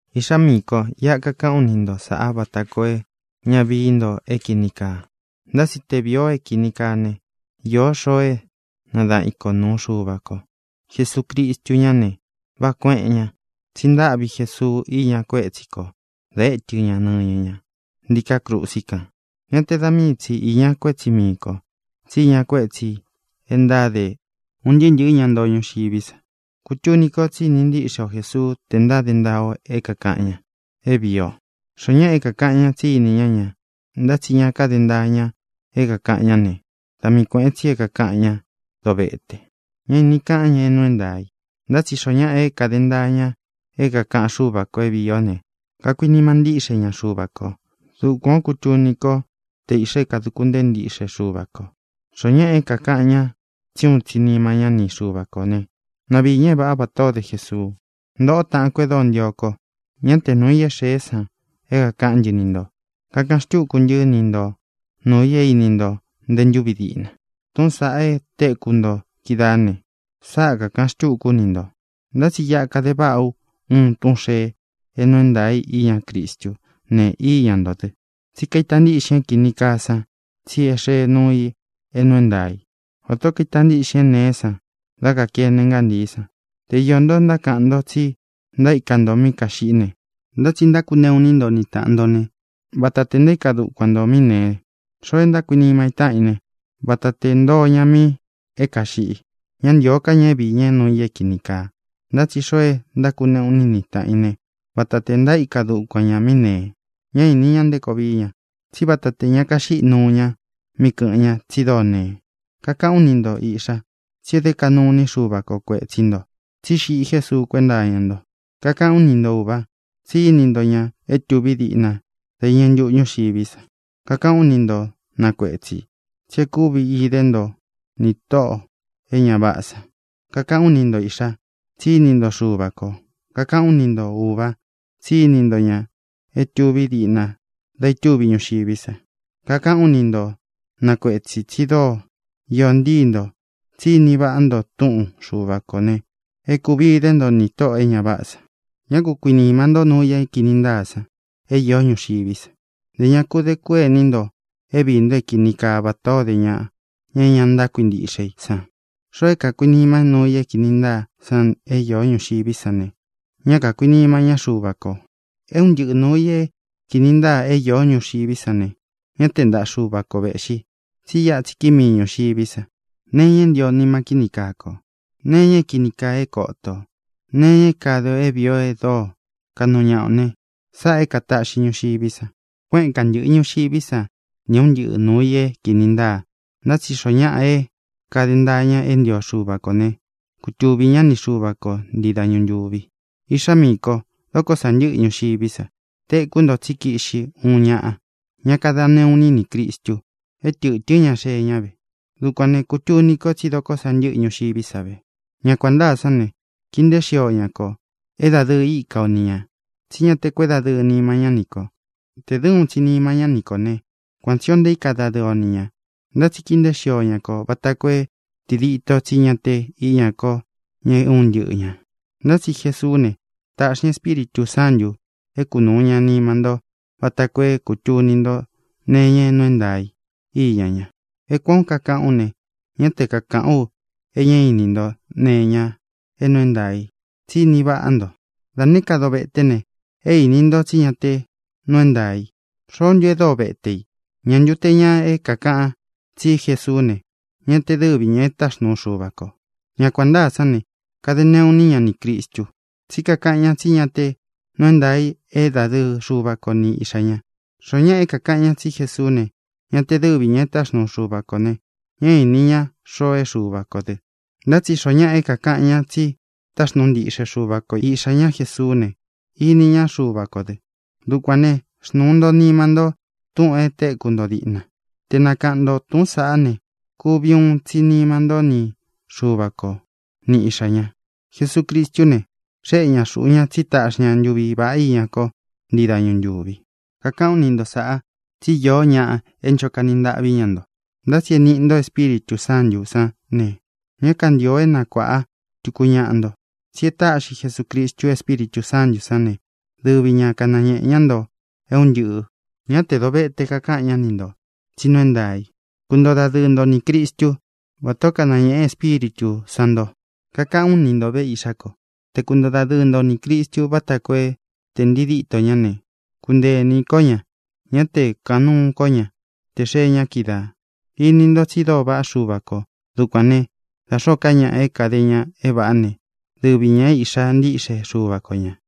Iꞌxá miī ko, iꞌa kakaꞌán u ni nto sāꞌa vata koo é ña vií nto é kīni kaa. Ntá tsi te vīi o é kīni kaa ne, īó xoo é nadaꞌan i kō nuu Xuva ko. Jesucristu ñá ne, váꞌā kueꞌén ña. Tsi ntáꞌvi Jesuu iña kuétsi kō da étɨ ña nɨñɨ ña ntíkā krusi kan. Ñá te da mii tsi īña kuétsi mii kō, tsí iña kuétsī e ntáde un ntɨɨ́ ntɨ̄ɨ́ ña ntoo ñuxiví sa. Kutuni ko tsí ini ntíꞌxe o Jēsuu te ntáde ntaa o é kākaꞌan ña é vīi o. Xoó ñaꞌa é kākaꞌan ña tsí ini ñá ña, ntá tsi ña káde ntaa ña é kākaꞌan ñá ne, da mii kuēꞌen tsi é kākaꞌan ñá dovete. Ñá īni kaꞌán ña é nuu é ntaā i. Ntá tsi xoo ñáꞌa é kāde ntaa ña é kākaꞌan Xúva kō é vīi ó ne, kakuinima ntíꞌxe ña Xuva kō. Dukuan ō kútuni ko te īꞌxa é kāduku ntée ntiꞌxe Xuva kō. Xoó ñaꞌa é kākaꞌan ña tsí uun tsi nima ñá ni Xuva kō né, na viī ña é vāꞌá vatā o dé Jesuu. Ntōꞌo, táꞌān ko e dóo ntio ko, ñá te nūu i é xeé san é kākaꞌán ntɨ ni ntō. Kakaꞌan xtúku ntɨ́ ni nto nūu i é īni nto nte ntúvi diꞌna. Tūꞌún san e téku nto kídaā ne, sáꞌa kākaꞌan xtúku ú ni ntō. Ntá tsi iꞌa kade váꞌa ú uun túꞌūn xee é nuu é ntaā i iñá Cristú ne, íña ntō dɨ. Tsí kaita ntiꞌxin é kīni kaa san tsi é xee nuu i é nuu é ntaā í, vatā ó kaita ntiꞌxin é nēé san dá kākene ngántií san. Te iō ntó ntákaꞌan ntó tsi ntaíka nto mí kāxiꞌí ne, ntá tsi ntákuneꞌu iní nto ni tāꞌan nto ne, vata te ntaíka dukuan ntō mi é nēe. Xoo e ntákuinima í taꞌan í ne, vata tē ntoo ña mi é kāxiꞌi. Ñá ntīo ká ña vií ña nuu i é kīni kaa. Ntá tsi xoo e ntákuneꞌu iní i ni tāꞌan í ne, vata te ntaíka dukuan ñā mi é nēe. Ña ini ña nté koo vií ña, tsí vata tē ña kaxíꞌi nuu ña míꞌi kɨ̄ꞌɨn ña, tsi dóo nee. Kakaꞌán u ni nto, īꞌxa, tsi e dé kaꞌnu iní Xuva ko kuētsí nto tsí xiꞌi Jésuu kuénta iña nto. Kakaꞌán u ni nto, ūva, tsí ini nto ña é tuví diꞌna da iñɨ ntuꞌu ñuxiví sa. Kakaꞌán u ni nto, na kuētsi, tsi e kúvi idé nto nī tóꞌō e ña váꞌā san. Kakaꞌán u ni nto, īꞌxa, tsí ini ntó Xuva kō. Kakaꞌán u ni nto, ūva, tsí ini nto ña é tuví diꞌna da itúvi ñuxiví sa. Kakaꞌán u ni nto, na kuētsi, tsi dóo iō ntíi ntō, tsí ini vaꞌá nto túꞌun Xuva kō ne, e kúvi idé nto nī tóꞌō e ña váꞌā san. Ñá ku kuinīma ntó nuu i é kīni ntáa san é īó ñuxiví sa; ntē ña ku dé kuení nto é viī nto é kini kaa vatā ó de ñaꞌa, ña é ña ntákuintiꞌxe i san. Xoo é kākuinima í nuu i é kīni ntáa san é īó ñuxiví sa ne, ñá kākuinima ñá Xuva kō. É un ntɨꞌɨ nūu i é kīni ntáa é īó ñuxiví sa ne, ñá te ntaꞌa Xuva ko vēꞌxi, tsí iꞌa tsi kíi mii ñūxiví sa. Nee iña é ntio nima kíni kaa ko, nee iña é kīni kaa é koto ō, nee iña é kāde i é vīi o e dóo kaꞌnu ñaꞌa o ne, sáꞌā é kātaꞌxi ñuxiví sa. Kuéꞌen kāntɨꞌɨ ñuxiví sa nī é un ntɨꞌɨ nūu i é kīni ntáa. Ntá tsi xoo ñáꞌa é kāde ntaa ña é ntio Xuva kō ne, kutuvī ñá ni Xuva ko ntii dañu ntūvi. Īꞌxá miī ko, dokó sa ntɨ́ꞌɨ ñuxiví sa. Tēkú nto tsí kiꞌxi uun ñaꞌa, ña kada neꞌu iní nī Cristu. É tɨ̄tɨ́n ña xée ñá ve. Dukuān ne, kutuni ko tsí dokó sa ntɨ́ꞌɨ ñuxiví sa ve. Ña kuān ntáa sán ne, kīi nteé xio ña kō, é dadɨɨ íka o ni ñā, tsí ña te kuédadɨɨ nima ñá ni kō. Tē dɨ́ uun tsi nima ñá ni kō né, kuan tsī o ntaíka dadɨɨ o ni ñā. Ntá tsi kīi nteé xio ña kō vata koo é tidito tsí ña te íña ko ña é un ntɨꞌɨ ñā. Ntá tsi Jesuú ne, tāꞌxi ña Espíritū Sántū é kunūu ña nima ntó vata koo é kūtuni ntó nee iña é nuu é ntaā í iña ña. É kuān ó kakaꞌu ú ne, ñá te kakāꞌán u é ña íni nto nee iña é nuu é ntaā i, tsí ini váꞌa nto. Da nēé ka dovete ne, é īni nto tsí ña te nuu é ntaā i. ¿Xoó ntu e dóo vete ī? ¿Ñā ntu te ña é kākaꞌan tsí Jesuú ne, ña te dɨ́vi ñā é taxnuu Xuva kō? Ña kuān ntáa sán ne, kade neꞌu iní ña nī Cristu, tsí kakaꞌan ña tsí ña te nuu é ntaā i é dadɨɨ Xuva ko ni Iꞌxā ña. Xoó ñaꞌa é kākaꞌan ñá tsi Jesuú ne, ña te dɨ́vi ñā é taxnuu Xuva kō ne, ñá īni ña xoo é Xuva kō dɨ. Ntá tsi xoó ñaꞌa é kākaꞌan ñá tsi táxnuu ntiꞌxe Xuva ko Iꞌxā ñá Jesuú ne, ini ñá Xuva kō dɨ. Dukuān né, xnūu nto nima nto túꞌūn e téku nto díꞌna. Te nakaꞌān ká nto túꞌūn saꞌá ne, kuvi uun tsi nima ntó ni Xuva ko, ni Iꞌxā ña. Jesucristú ne, xéꞌe ñā xuꞌu ña tsí taꞌxi ña ntuvi vāꞌá iña ko ntii dañu ntúvi. Kakaꞌán u ni nto sāꞌa tsí iō ñáꞌa é ncho kani ntaꞌví ña nto. Ntá tsi é nīꞌi nto Espíritū Sántū sán ne, ñá kantīo é nakuāꞌa tuku ñaꞌa nto. Tsi e táꞌxi Jesūcristu Espíritū Sántū sán ne, dɨvi ña kanañēꞌe ñá nto é un ntɨꞌɨ̄. Ñá tē dovete kakáꞌan ñá ni ntō, tsí nuu é ntaā i. Kuntoo dadɨɨ nto nī Cristu, vátā ó kanañēꞌe Espíritū san nto. Kakaꞌán u ni nto ve, īꞌxá ko, te kuntoo dadɨɨ nto nī Cristu vata koo é tē ntii díto ña ne, kunteē ini ko ña, ñá te kūkaꞌan nuú ko ña tē xee ña kídaā. Ini ntó tsi dóo vaꞌá Xuva kō. Dukuān né, da xōó ka ñaꞌa é kāde ña é vāꞌá ne, dɨvi ñā é īꞌxá ntiꞌxe Xuva ko ñā.